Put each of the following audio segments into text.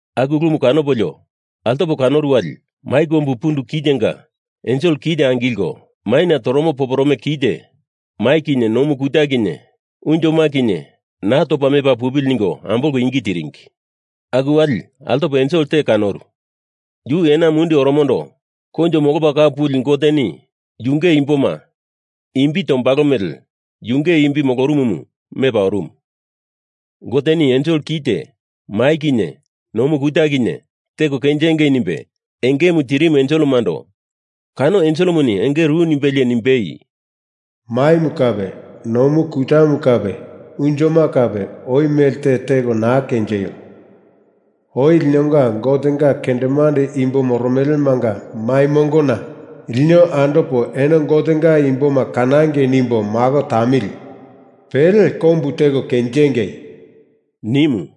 Aku ulumu kanopolio altopo kanoru wali mai kombu pundu kitenga ensel kite angilko, maina toromo poporome kite mai kinye nomu kuta kinye unjoma kinye naa topa mepa pupili ningo ambolko ingi tiringi. Aku wali altopo ensel te kanoru, yu ena mundi oromondo Koinjo Molopa Kau Puli Goteni yunge imboma imbi tombalo mele Yunge imbi moromomu mepa orumu. Goteni ensel kite mai kinye nomu kuta kinye teko kenjingei nimbe engemu tirimu enselemando kano enselemuni enge ru nimbelie nimbei, “Maimu kape nomu kutamu kape unjoma kape oi melte teko naa kenjeio! Oi linonga Gotenga kendemande imbo moromelemanga mai mongona lino andopo eno Gotenga imboma kanangei nimbo mako tamili! Pele kombu teko kenjengei!” nimu.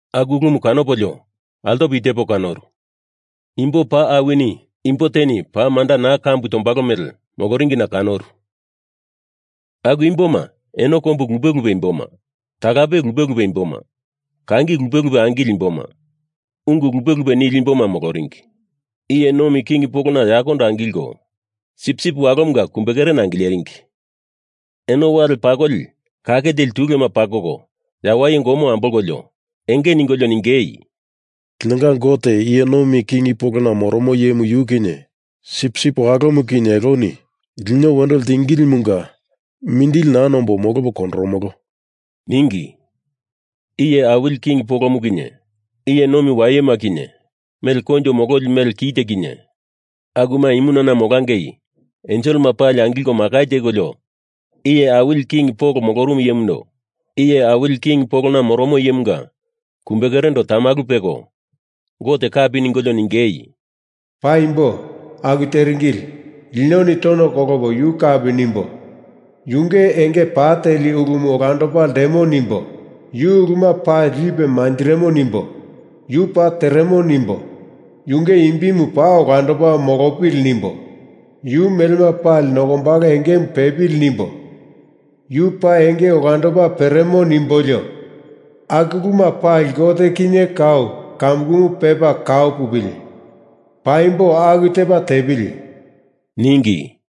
Aku ulumu kanopolio, altopo i tepa kanoru. Imbo paa awini, imbo teni paa manda kambu naa tombalo mele, moloringina kanoru. Aku imboma eno kombu lupe lupe imboma, talape lupe lupe imboma, kangi lupe lupe angileli imboma, ungu lupe lupe nili imboma moloringi. Iye nomi king polona yakondo angilko, Sipsip Walomunga kumbe kerena angileringi. Eno wali pakoli kake teli tulema pakoko yawaye gomo ambolkolio, enge ningolio ningei, “Linonga Gote iye nomi king polona moromo Iyemu yu kinye Sipsip Walomu kinye eloni lino wendo ltingilimunga mindili naa nombo molopo kondoromolo,” ningi. Iye awili king polomu kinye, iye nomi wayema kinye, mele koinjo mololi mele kite kinye, akuma imunana molangei enselema pali angilko makai tekolio iye awili king polona moromo iyemunga kumbekerendo tamalu peko Gote kapi ningolio ningei, “Paimbo, aku teringili. Linoni tono kolopo yu kapi nimbo, yunge enge pa teli ulumu olandopa ltemo nimbo, yu uluma pali lipe manjirimo nimbo, yu paa tereno nimbo, yunge imbimu paa olandopa molopili nimbo, yu melema pali nokombalo engemu pepili nimbo, yu paa enge olandopa peremo nimbolio, aku uluma pali Gote kinye kau kamukumu pepa kau pupili! Paimbo, aku tepa tepili!” ningi.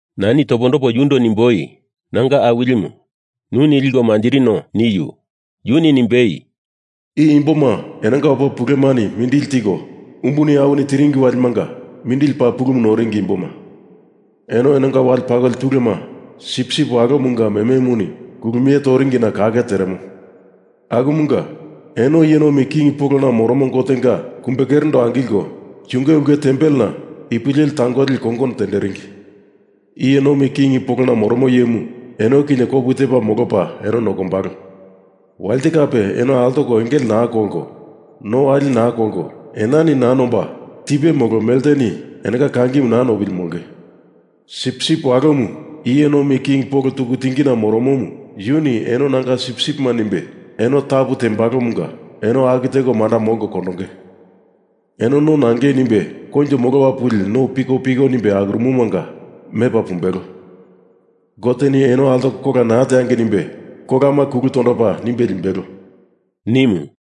Nani topondopo yundo nimboi, “Nanga awilimu, nuni liko manjirino,” niu. Yuni nimbei, “I imboma enonga opa pulemani mindili tiko umbuni awini tiringi walimanga mindili paa pulumu noringi imboma. Eno enonga wale pakoli tulema Sipsip Walomunga mememuni kulumie toringina kake teremo. Akumunga, “Eno iye nomi king polona moromo Gotenga kumbekerendo angilko, yunge ulke tempelena ipu leli tangoli kongono tenderingi. Iye nomi king polona moromo iyemu eno kinye kopu tepa molopa eno nokombalo. Walite kape eno altoko engele naa kolko no wali naa kolko, enani naa nomba, tipe molo melteni enonga kangimu naa nopili molonge. Sipsip Walomu iye nomi king polona tuku tingina moromomu yuni eno nanga sipsipima nimbe eno tapu tembalomunga eno aku teko manda molko kondonge. Eno no nangei nimbe koinjo molopa puli no pikopiko nimbe akuromomanga mepa pumbelo. Goteni eno altoko kola naa teangei nimbe kolama kulu tondopa nimbe limbelo,” nimu.